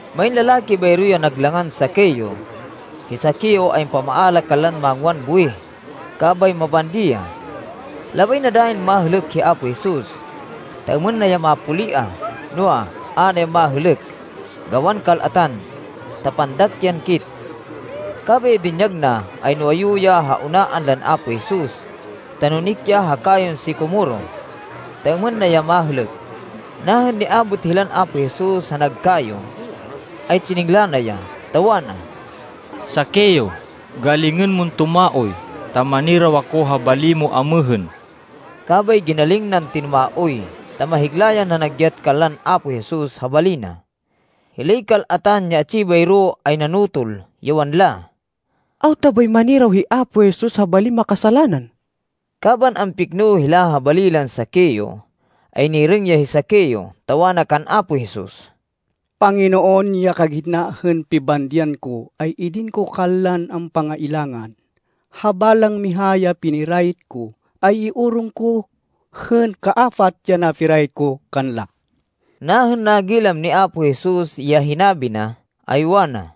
Main lalaki bayro ya nag langan Zaqueo. Hi Zaqueo ay ampamaala kanlan mangwan buwih, kabay mabandi ya. Labay na dayin mahêlêk hi Apo Jesus, ta êmên na ya mapuliah, noa, a na ya mahêlêk, gawan kal-atan, ta pandak yan kit. Kabay ya dinyag na, ay nuwayu ya ha unaan lan Apo Jesus, ta nunik ya ha kayon sikomoro, ta êmên na ya mahêlêk. Nahên niabot hilan Apo Jesus ha nag kayo, ay tsiningla na ya, ta wana, “Zaqueo, galingên mon tumaoy, ta maniraw ako ha bali mo amêhên.” Kabay ginaling nan tinumaoy, ta mahigla yan nanagyat kanlan Apo Jesus ha bali na. Hilay kal-atan ya atsi bayro ay nanotol, ya wanla, “Awta bay maniraw hi Apo Jesus ha balin makasalanan!” Kaban ampikno hila ha bali lan Zaqueo ay nirêng ya hi Zaqueo, ta wana kan Apo Jesus, “Panginoon, ya kagitna hên pibandian ko ay idin ko kanlan ampangailangan. Ha balang miha ya pinirayit ko, ay iorong ko hên kaapat ya napirayit ko kanla.” Nahên nagilam ni Apo Jesus ya hinabi na, ay wana,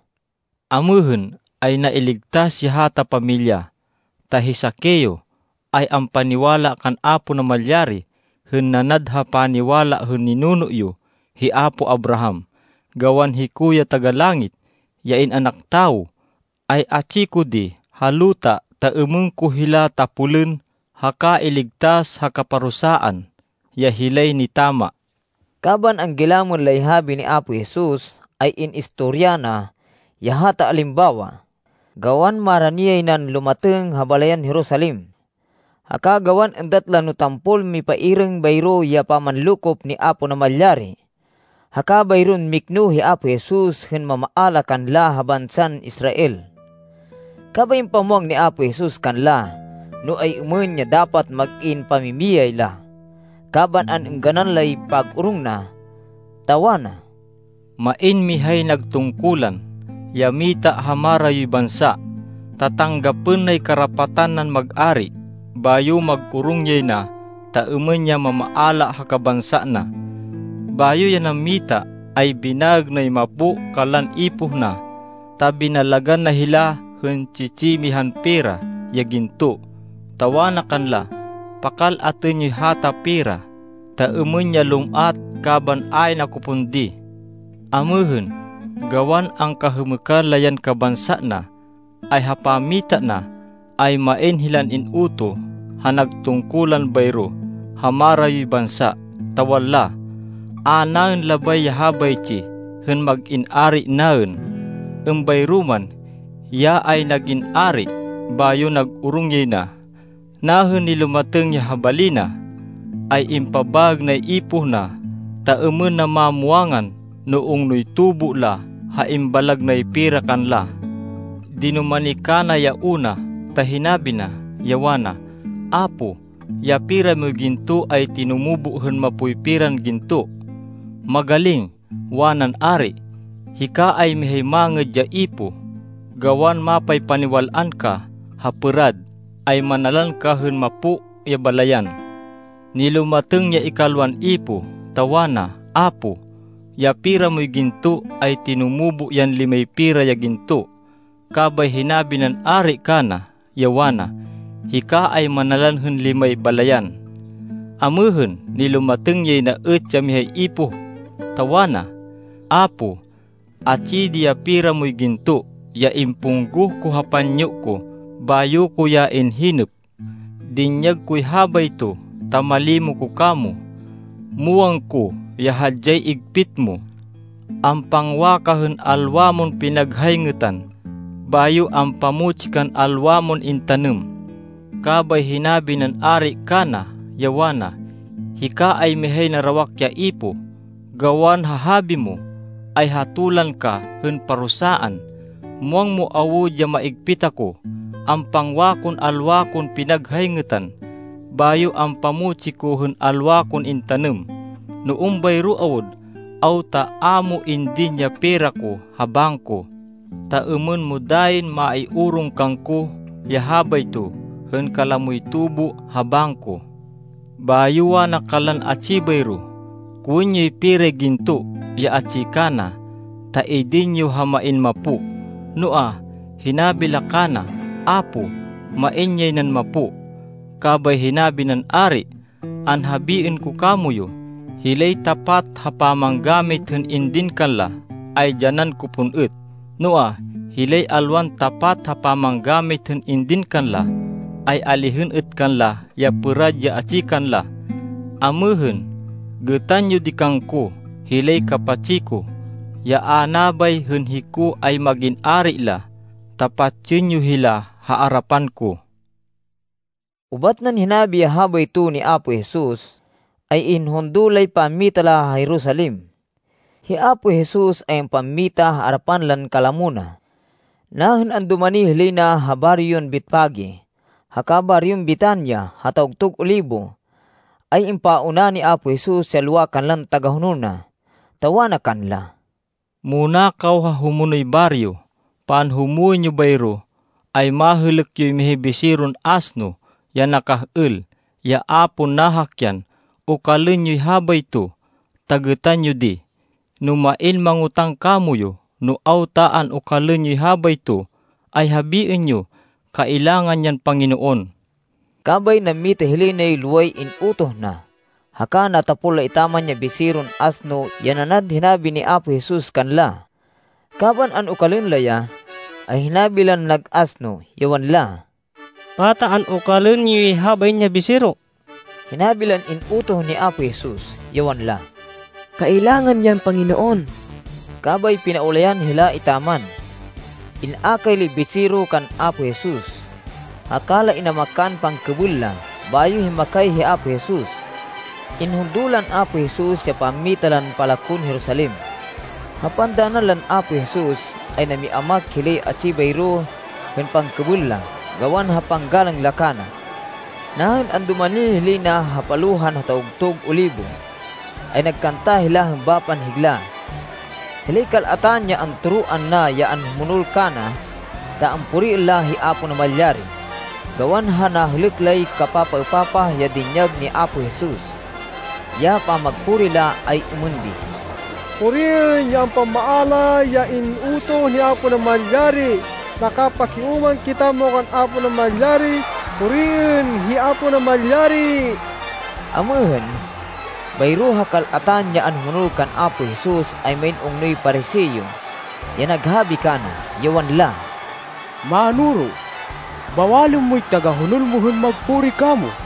“Amêhên ay nailigtas ya hata pamilya, ta hi Zaqueo ay ampaniwala kan Apo Namalyari hên nanad ha paniwala hên ninuno yo hi apo Abraham. Gawan hiko ya Taga-Langit, ya In-anak Tawo, ay atsi ko di ha luta ta êmên ko hila tapolên haka iligtas ha kaparusaan ya hilay nitama.” Kaban anggilamên lay habi ni Apo Jesus, ay in-istorya na ya hata alimbawa, gawan marani yay nan lumatêng ha balayan Jerusalem. Haka gawan êndat la no tampol mipairêng bayro ya pamanlokop ni Apo Namalyari, haka bayron mikno hi Apo Jesus hên mamaala kanla ha bansan Israel. Kabay impamwang ni Apo Jesus kanla no ay-êmên ya dapat mag-in pamimiyay la, kaban an-êngganan lay pag-orong na, ta wana, “Main mihay nag tungkulan, ya mita ha marayoy bansa, ta tanggapên nay karapatan nan mag-ari, bayo mag-orong yay na ta êmên ya mamaala ha kabansa na. Bayo ya nammita ay binaêg nay mapo kanlan ipoh na, ta binalagan na hila hên tsi-tsi mihan pera ya ginto, ta wana kanla, ‘Pakal-atên yoy hata pera, ta êmên ya lum-at kaban ayn ako pon di.’ Amêhên, gawan angkahêmêkan la yan kabansa na, ay ha pammita na, ay main hilan in-utoh ha nag tungkulan bayro ha marayoy bansa, ta wanla, ‘A naên labay ya habaytsi hên mag-in ari naên.’ “Êmbayro man, hiya ay nag-in ari, bayo nag-orong yay na. Nahên nilumatêng ya ha bali na, ay impabaêg nay ipoh na, ta êmên na mamwangan no ungnoy tubo la ha imbalag nay pera kanla. Dinumani kana ya una, ta hinabi na, ya wana, ‘Apo, ya pera moy ginto ay tinumubo hên mapoy peran ginto.’ “‘Magaling,’ wanan ari, ‘Hika ay mihay mangêd ya ipoh. Gawan mapaypaniwal-an ka ha pêrad, ay manalan ka hên mapo ya balayan.’ “Nilumatêng ya ikalwan ipoh, ta wana, ‘Apo, ya pera moy ginto ay tinumubo yan limay pera ya ginto.’ “Kabay hinabi nan ari kana, ya wana, ‘Hika ay manalan hên limay balayan.’ “Amêhên, nilumatêng yay na êt ya mihay ipoh, ta wana, ‘Apo, atsi di ya pera moy ginto, ya impunggoh ko ha panyo ko, bayo ko ya inhinêp. Dinyag koy habayto ta malimo ko kamo. Muwang ko ya hadyay igpit mo. Ampangwa ka hên alwa mon pinaghayngêtan, bayo ampamutsi kan alwa mon intanêm.’ “Kabay hinabi nan ari kana, ya wana, ‘Hika ay mihay narawak ya ipoh. Gawan ha habi mo, ay hatolan ka hên parusaan. Muwang mo awud ya maigpit ako. Ampangwa kon alwa kon pinaghayngêtan, bayo ampamutsi ko hên alwa kon intanêm. No êmbayro awud, awta a mo indin ya pera ko ha bangko, ta êmên mo dayin maiorong kangko ya habayto hên kalamoy tubo ha bangko?’ Bayo wana kanlan atsi bayro, ‘Kowên yoy peray ginto, ya atsi kana, ta idin yo ha main mapo.’ Noa, hinabi la kana, ‘Apo, main yay nan mapo!’ Kabay hinabi nan ari, ‘Anhabiên ko kamoyu, hilay tapat ha pamanggamit hên indin kanla, ay dyanan ko pon êt. Noa, hilay alwan tapat ha pamanggamit hên indin kanla, ay alihên êt kanla ya pêrad ya atsi kanla. Amêhên, gêtan yo di kangko hilay kapatsi ko, ya a nabay hên hiko ay mag-in ari la, ta patsên yo hila ha arapan ko.’” Ubat nan hinabi ya habayto ni Apo Jesus, ay inhundo lay pammita la ha Jerusalem. Hi Apo Jesus ay ampammita ha arapan lan kalamo na. Nahên andumani hilay na ha baryon Betfage, haka baryon Betania ha Tawgtug Olibo, ay impauna ni Apo Jesus ya lowa kanlan tagahonol na, ta wana kanla, “Muna kaw ha humonoy baryo. Panhumwên yo bayro, ay mahêlêk yoy mihay biseron asno, ya nakah-êl, ya a pon nahakyan. Okalên yoy habayto, ta gêtan yo di. No main mangotáng kamoyu no awta an-okalên yoy habayto, ay habiên yo, ‘Kailangan yan Panginoon.’” Kabay nammita hilay nay loway in-utoh na. Haka natapol la etaman ya biseron asno ya nanad hinabi ni Apo Jesus kanla. Kaban an-okalên la ya, ay hinabi lan nag asno, ya wanla, “Pata an-okalên yoy habain ya bisero?” Hinabi lan in-utoh ni Apo Jesus, ya wanla, “Kailangan yan Panginoon.” Kabay pinaulayan hila etaman. In-akay lay bisero kan Apo Jesus, haka la inamakan pangkêbêl la, bayo himmakay hi Apo Jesus. Inhundo lan Apo Jesus ya pammita lan palakon Jerusalem. Ha pandanan lan Apo Jesus, ay nami-amak hilay atsi bayro hên pangkêbêl la, gawan ha panggalang la kana. Nahên andumani hilay na ha palohan ha Tawgtug Olibo, ay nagkanta hila hên bapan higla, hilay kal-atan ya antoroan na ya anhumonol kana, ta ampuriên la hi Apo Namalyari, gawan ha nahêlêk lay kapapaêpapah ya dinyag ni Apo Jesus. Ya pamagpuri la ay êmên di, “Puriên ya ampamaala ya in-utoh ni Apo Namalyari! Nakapakiúmang kitamo kan Apo Namalyari! Puriên hi Apo Namalyari!” Amêhên, bayro ha kal-atan ya anhumonol kan Apo Jesus, ay main ungnoy Pariseo ya naghabi kana, ya wanla, “Mánoro, bawalên moy tagahonol mo hên magpuri kamo.”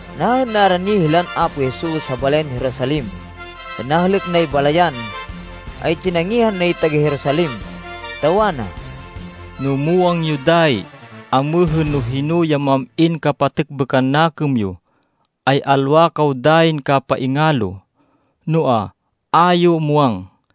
Nahên narani hilan Apo Jesus ha balayan Jerusalem, hên nahêlêk nay balayan, ay tsinangihan nay taga-Jerusalem, ta wana, “No muwang yo dayi amêhên no hino ya mam-in kapatêkbêkan nakêm yo, ay alwa kaw dayin kapaingalo! Noa, a yo muwang.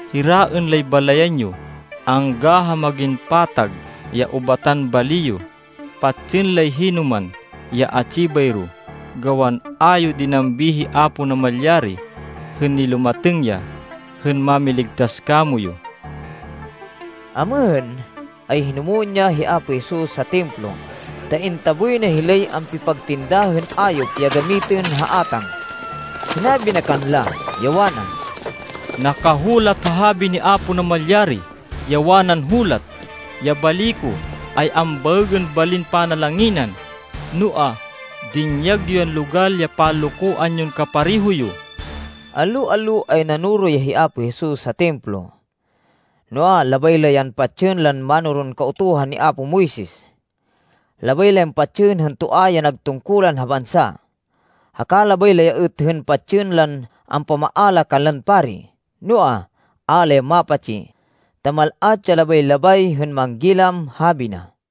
Hiraên lay balayan yo angga ha mag-in patag ya ubatan bali yo. Patsên lay hinoman ya atsi bayro, gawan a yo dinambi hi Apo Namalyari hên nilumatêng ya hên mamiligtas kamoyu.” Amêhên, ay hinumwên ya hi Apo Jesus ha Templo, ta intaboy na hilay ampipagtinda hên ayop ya gamitên ha átang. Hinabi na kanla, ya wana, “Nakahulat ha habi ni Apo Namalyari, ya wanan hulat, ‘Ya bali ko ay ambaêgên balin panalanginan.’ Noa, dinyag yo yan logal ya panlokoan yon kapareho yo!” Allo-allo ay nanoro ya hi Apo Jesus ha Templo. Noa, labay la yan patsên lan mánoron Kautuhan ni apo Moises. Labay la yan patsên hên toa ya nag tungkulan ha bansa. Haka labay la ya êt hên patsên lan ampamaala kanlan pari. Noa, a la ya mapatsi, ta mal-at ya labay-labay hên manggilam habi na.